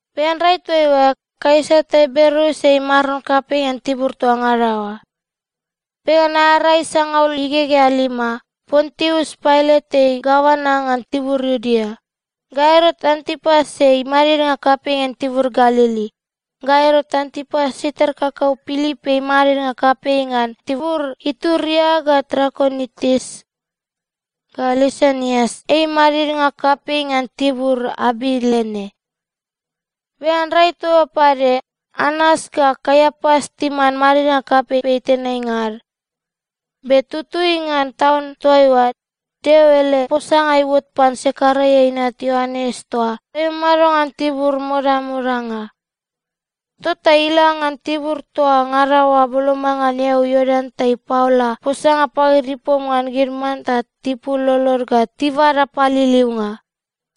Be ngan rai toaiua, Kaisa Taiberius ei maron kapei ngan tibur toa ngada oa. Be ngan aea rai sangaul igegea lima, Pontius Pailat ei gavana ngan tibur Iudea, ga Erot Antipas ei madidnga kapei ngan tibur Galili, ga Erot Antipas itar kakau Pilip ei madidnga kapei ngan tibur Ituria ga Trakonitis, ga Lisanias ei madidnga kapei ngan tibur Abilene. Be ngan rai toa oa pade, Anas ga Kaiapas timan madidnga kapeipei tenainga ad. Be tutui ngan taun toaiua, Deo ele posanga iuot pan Sekaraia inat Ioanes toa imamado ngan tibur modamodanga. Tota ila ngan tibur toa ngada oa boloma ngan eau Iordan ta ipaola posanga pagid ipom ngan gid manta tipul lolod ga tibada paliliunga,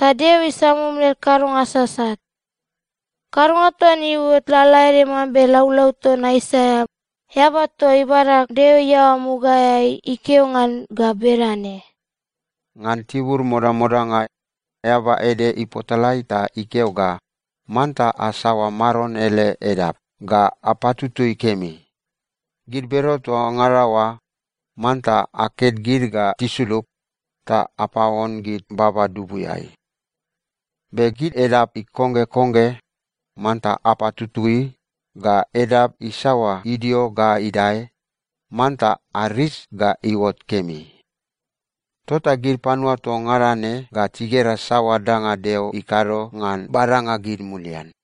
ta Deo isamum led kadonga sasat. Kadonga toa ne iuot lalaede mambe laulau ton Aisaia, eaba toa ibada Deo iaoa mugaeai ikeo ngan ga bedane, “Ngan tibur modamodanga, eaba ede ipotalae ta ikeo ga, ‘Manta asaoa Maron ele edap ga apatutui kemi! Gid bereo toa ngada oa, manta aket gid ga tisulug, ta apaon gid baba dubuiai. Be gid edap ikonggekongge, manta apatutui, ga edap isaoa idio ga idae, manta aris ga iuot kemi. Tota gid panua toa ngada ne ga tigera saoa danga Deo ikado ngan badanga gid mulian.’”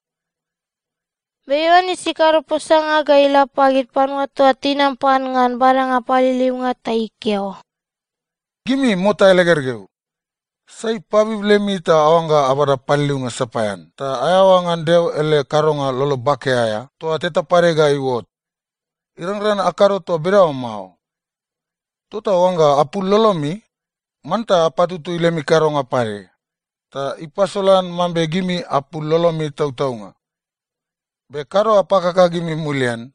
Be Ioanes ikado posanga ga ila pagid panua toa tinam pan ngan badanga paliliunga ta ikeo, “Gimi mota ele gergeu! Sai ipabib lemi ta aoangga abada paliliunga sapaean ta aeaoa ngan Deo ele kadonga lolo bake aea toa teta pade ga iuot? Irangrang ngan akado toa bedaoa mao. Tota oangga apul lolomi, manta apatutui lemi kadonga pade, ta ipasolan mambe gimi apul lolomi tautaunga. Be kado apakaka gimi mulian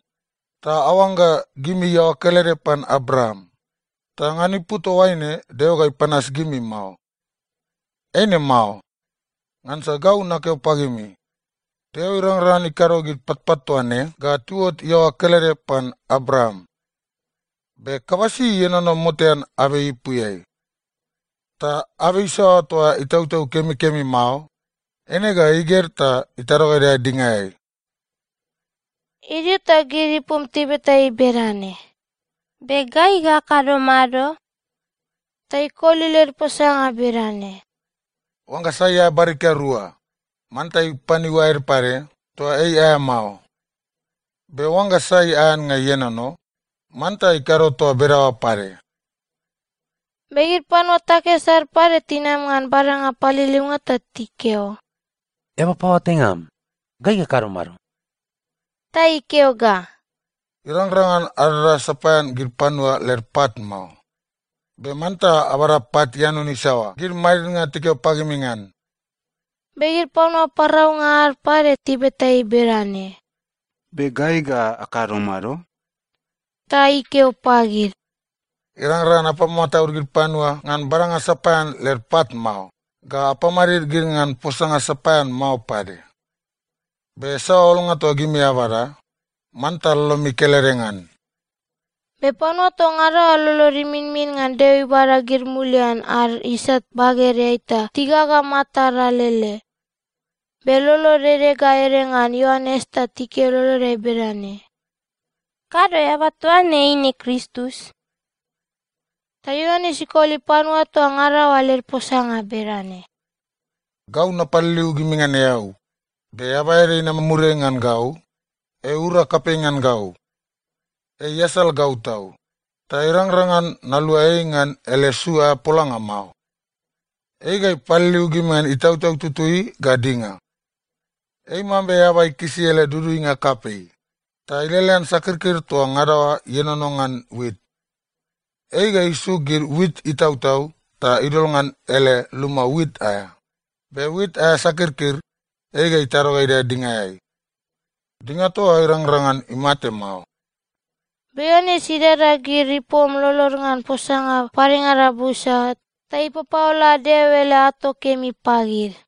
ta aoangga gimi iaoa kelede pan Abraam, ta ngan ipu toaine Deo ga ipanas gimi mao. Eine mao. Ngansa gau nakeo pagimi, Deo irangrang ngan ikado gid patpat toa ne ga tiuot iaoa kelede pan Abraam. Be kabasi ienono motean abei ipuiai. Ta abei isaoa toa itautau kemikemi mao, eine ga iged ta itado ga idae dingaeai.” Idio ta gid ipom tibeta ei bedane, “Be gai ga akado mado?” Ta ikoli led posanga bedane, “Oangga sai aea barikia rua, manta ipan iuae ede pade, toa ei aea mao. Be oangga sai aea annga ienono, manta ikado toa bedaoa pade.” Be gid panua takis ad pade tinam ngan badanga paliliunga ta tikeo, “Eaba paoatainga am, gai ga akado mado?” Ta ikeo ga, “Irangrang ngan adada sapaean gid panua led pat mao. Be manta abada pat ianun isaoa gid madidnga tikeo pagimi ngan.” Be gid panua paraunga ad pade tibeta ei bedane, “Be gai ga akado mado?” Ta ikeo pagid, “Irangrang ngan apamataud gid panua ngan badanga sapaean led pat mao ga apamadid gid ngan posanga sapaean mao pade. Be saoa olnga toa gimi abada, manta lolomi kelede ngan.” Be panua toa ngada oa lolod iminmin ngan Deo ibada gid mulian ad isat bagedeai ta tigaga matad alele. Be lolod ede ga ede ngan Ioanes ta tikeo lolodeai bedane, “Kado eaba toa ne eine Kristus?” Ta Ioanes ikoli panua toa ngada oa led posanga bedane, “Gau napaliliu gimi ngan eau, be eaba ede inam muriai ngan gau, ei iura kapei ngan gau. Ei iasal gau tau, ta irangrang ngan nalua ei ngan ele su aea polanga mao. Ei ga ipaliliu gimi ngan Itautau Tutui ga dinga. Ei mambe eaba ikisi ele duduinga kapei, ta ilelean sakirkir toa ngada oa ienono ngan wit. Ei ga isuk gid wit itautau ta idol ngan ele luma wit aea. Be wit aea sakirkir, ei ga itado ga idae dingaeai. Dinga toa oa irangrang ngan imate mao.” Be Ioanes idada gid ipom lolod ngan posanga padengada busa, ta ipapaola Deo ele ato kemi pagid.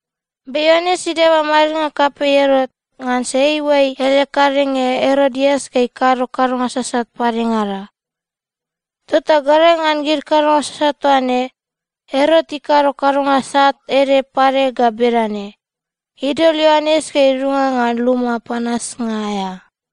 Be Ioanes idaba madidnga kapei Erot, ngansa ei iuai ele kadenge Erodias ga ikado kadonga sasat padengada. Tota gadae ngan gid kadonga sasat toa ne, Erot ikado kadonga sat ede pade ga bedane: Idol Ioanes ga idudunga ngan luma panasnga aea.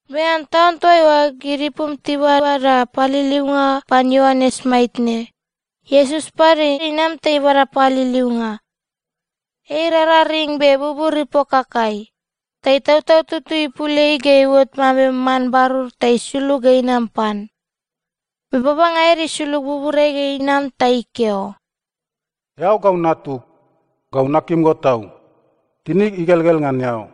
Be ngan taun toaiua gid ipom tibabada paliliunga pan Ioanes maitne, Iesus pade inam ta ibada paliliunga. Ei irararing, be bubur ipokakai, ta Itautau Tutui ipul ei ga iuot mambe man barur ta isulug ga inam pan. Be babanga ede isulug buburiai ga inam ta ikeo, “Eao gau Natug. Gau nakim go tau. Tinig igelgel ngan eao.”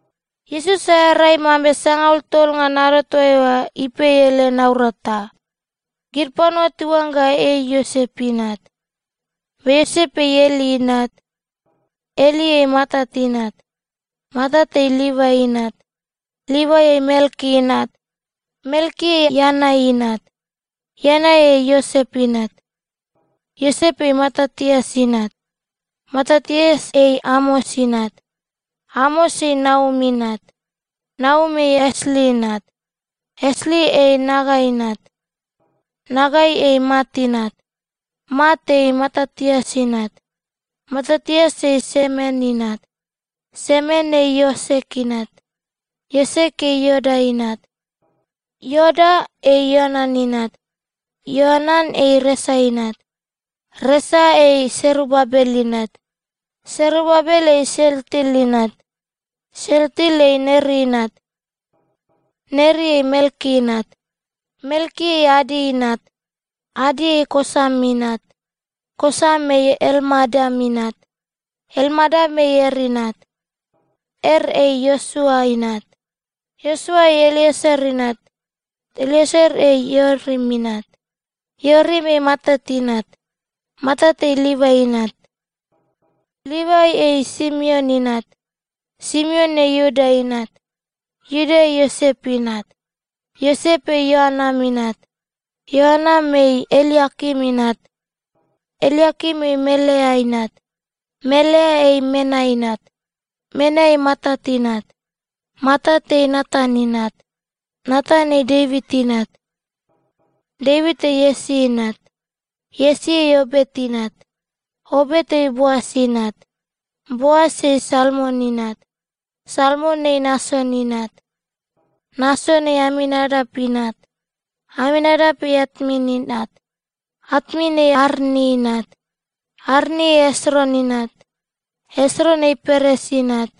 Iesus aea rai mambe sangaul tol ngan ado toaiua ipei ele naurata. Gid panua tiuangga ei Iosep inat. Be Iosep ei Eli inat. Eli ei Matat inat. Matat ei Livai inat. Livai ei Melki inat. Melki ei Ianai inat. Ianai ei Iosep inat. Iosep ei Matatias inat. Matatias ei Amos inat. Amos ei Naum inat. Naum ei Esli inat. Esli ei Nagai inat. Nagai ei Mat inat. Mat ei Matatias inat. Matatias ei Semen inat. Semen ei Iosek inat. Iosek ei Ioda inat. Ioda ei Ioanan inat. Ioanan ei Resa inat. Resa ei Serubabel inat. Serubabel ei Sealtiel inat. Sealtiel ei Neri inat. Neri ei Melki inat. Melki ei Adi inat. Adi ei Kosam inat. Kosam ei Elmadam inat. Elmadam ei Er inat. Er ei Iosua inat. Iosua ei Elieser inat. Elieser ei Iorim inat. Iorim ei Matat inat. Matat ei Livai inat. Livai ei Simeon inat. Simeon ei Iuda inat. Iuda ei Iosep inat. Iosep ei Ionam inat. Ionam ei Eliakim inat. Eliakim ei Melea inat. Melea ei Mena inat. Mena ei Matata inat. Matata ei Natan inat. Natan ei Devit inat. Devit ei Iesi inat. Iesi ei Obet inat. Obet ei Boas inat. Boas ei Salmon inat. Salmon ei Nason inat. Nason ei Aminadap inat. Aminadap ei Atmin inat. Atmin ei Arni inat. Arni ei Esron inat. Esron ei Peres inat.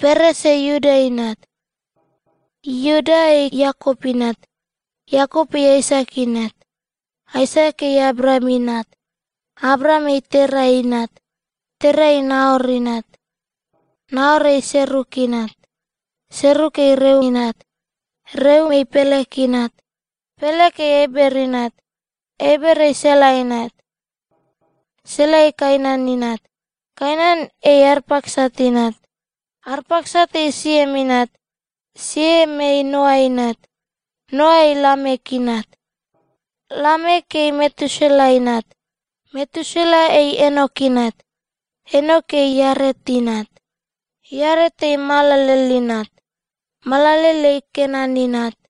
Peres ei Iuda inat. Iuda ei Iakop inat. Iakop ei Aisak inat. Aisak ei Abraam inat. Abraam ei Tera inat. Tera ei Naor inat. Naor ei Seruk inat. Seruk ei Reu inat. Reu ei Pelek inat. Pelek ei Eber inat. Eber ei Sela inat. Sela ei Kainan inat. Kainan ei Arpaksat inat. Arpaksat ei Siem inat. Siem ei Noa inat. Noa ei Lamek inat. Lamek ei Metusela inat. Metusela ei Enok inat. Enok ei Iaret inat. Iaret ei Maalalel inat. Maalalel ei Kenan inat.